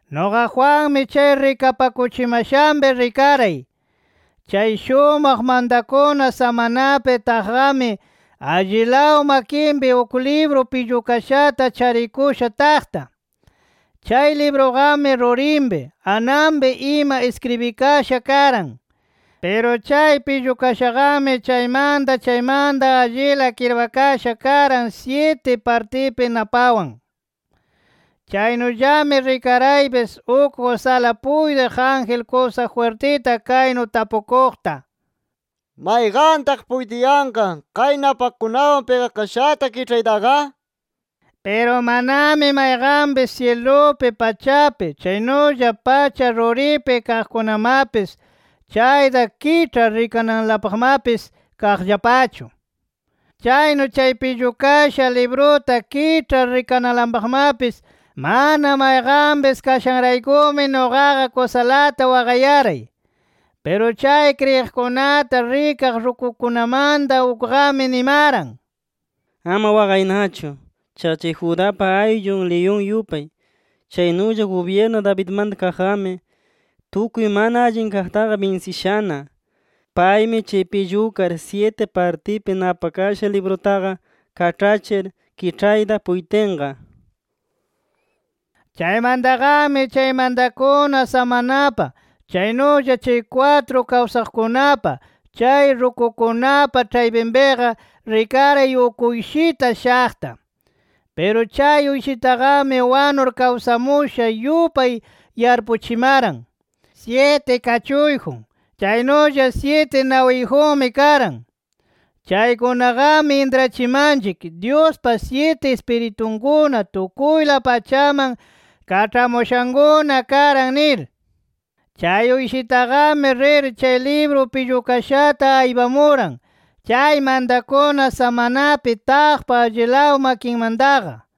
Nuqa Juanmi chay rikapakuchimashanpi rikaray, chay shumaq mantakuna samanapi taqqami, allilaw makinpi uk libru pillukashata charikusha taqta. Chay libruqami rurinpi, ananpi ima iskribikasha karan. Piru chay pillukashaqami chaymanta chaymanta allila kirpakasha karan syiti partipi napawan. Chaynullami rikaraypis uk kusala puytiq ángel kusa jwirtita kaynu tapukuqta: “¿Mayqantaq puytiyanqa kay napakunawan pigakashata kiĉhaytaqa?” nir. Piru manami mayqanpis syilupi, pachapi, chaynulla pacha ruripi kaqkunamapis chayta kiĉhar rikananlapaqmapis kaqllapachu. Chaynu chay pillukasha libruta kiĉhar, rikananlapaqmapis mana mayqanpis kashanraykumi nuqaqa kusalata waqayaray. Piru chay kriyiqkunata rikaq rukukunamanta ukqami nimaran: “Ama waqaynachu. Chaqa chay Judapa ayllun liyun yupay, chaynulla gubyirnu Davidmanta kaqqami, tukuy mana allin kaqtaqa binsishana. Paymi chay pillukar syiti partipi napakasha librutaqa kaĉhachir kiĉhayta puytinqa” nir. Chaymantaqami chay mantakuna samanapa, chaynulla chay kwatru kawsaqkunapa, chay rukukunapa ĉhaypinpiqa, rikaray uk Uyshita shaqta. Piru chay Uyshitaqami wanur kawsamusha yupay yarpuchimaran. Syiti kachuyjun, chaynulla syiti nawiyjunmi karan. Chaykunaqami intrachimanchik, Dyuspa syiti Ispiritunkuna tukuyla pachaman kaĉhamushankuna karan nir. Chay Uyshitaqami rir, chay libru pillukashata aypamuran chay mantakuna samanapi taqpa allilaw makinmantaqa.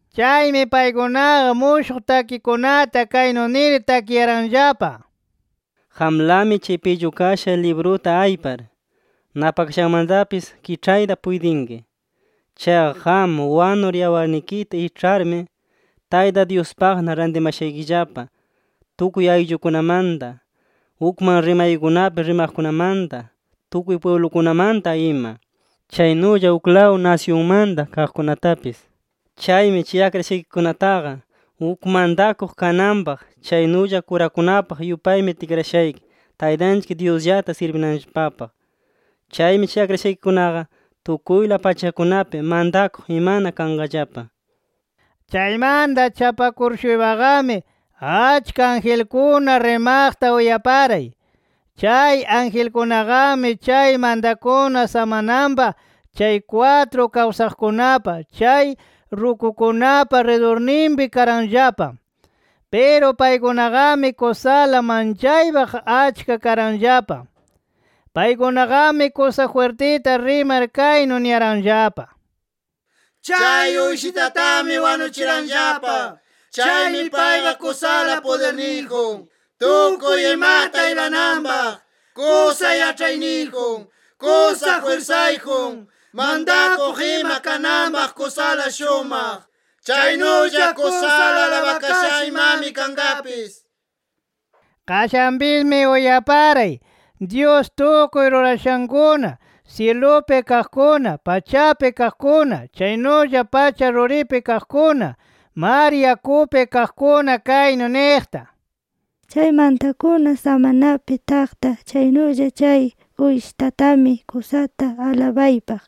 Chaymi paykunaqa mushuq takikunata kaynu nir takiyaranllapa: “Qamlami chay pillukasha libruta aypar, napakashanmatapis kiĉhayta puytinki. Chaqa qam wanur yawarnikita iĉharmi, Tayta Dyuspaqna rantimashaykillapa tukuy ayllukunamanta, ukman rimaykunapi rimaqkunamanta, tukuy pwiblukunamanta ima. Chaynulla uklaw nasyunmanta kaqkunatapis. Chaymi chay akrashaykikunataqa uk mantakuq kananpaq, chaynulla kurakunapaq yupaymi tikrashayki Taytanchik Dyusllata sirbinanllapapaq. Chaymi chay akrashaykikunaqa tukuyla pachakunapi mantakuq imana kanqallapa”. Chaymanta chapakur-shuypaqami, achka angelkuna rimaqta uyaparay. Chay angelkunaqami chay mantakuna samananpa, chay kwatru kawsaqkunapa, chay rukukunapa ridurninpi karanllapa. Piru paykunaqami kusala manchaypaq achka karanllapa. Paykunaqami kusa jwirtita rimar kaynu niyaranllapa: “¡Chay Uyshitatami wanuchiranllapa! ¡Chaymi payqa kusala pudirniyjun, tukuy imata aypananpaq, kusa yaĉhayniyjun, kusa jwirsayjun, mantakuq ima kananpaq kusala shumaq! ¡Chaynulla kusala alabakasha imami kanqapis!” nir. Qashanpismi uyaparay, Dyus tukuy rurashankuna syilupi kaqkuna, pachapi kaqkuna, chaynulla pacha ruripi kaqkuna, mar yakupi kaqkuna kaynu niqta: “¡Chay mantakuna samanapi taqta, chaynulla chay Uyshitatami, kusata alabaypaq,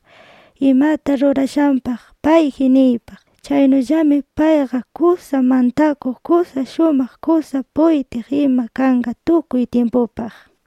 imata rurashanpaq payji niypaq! ¡Chaynullami payqa kusa mantakuq, kusa shumaq, kusa puytiq ima kanqa tukuy tyimpupaq!” nir.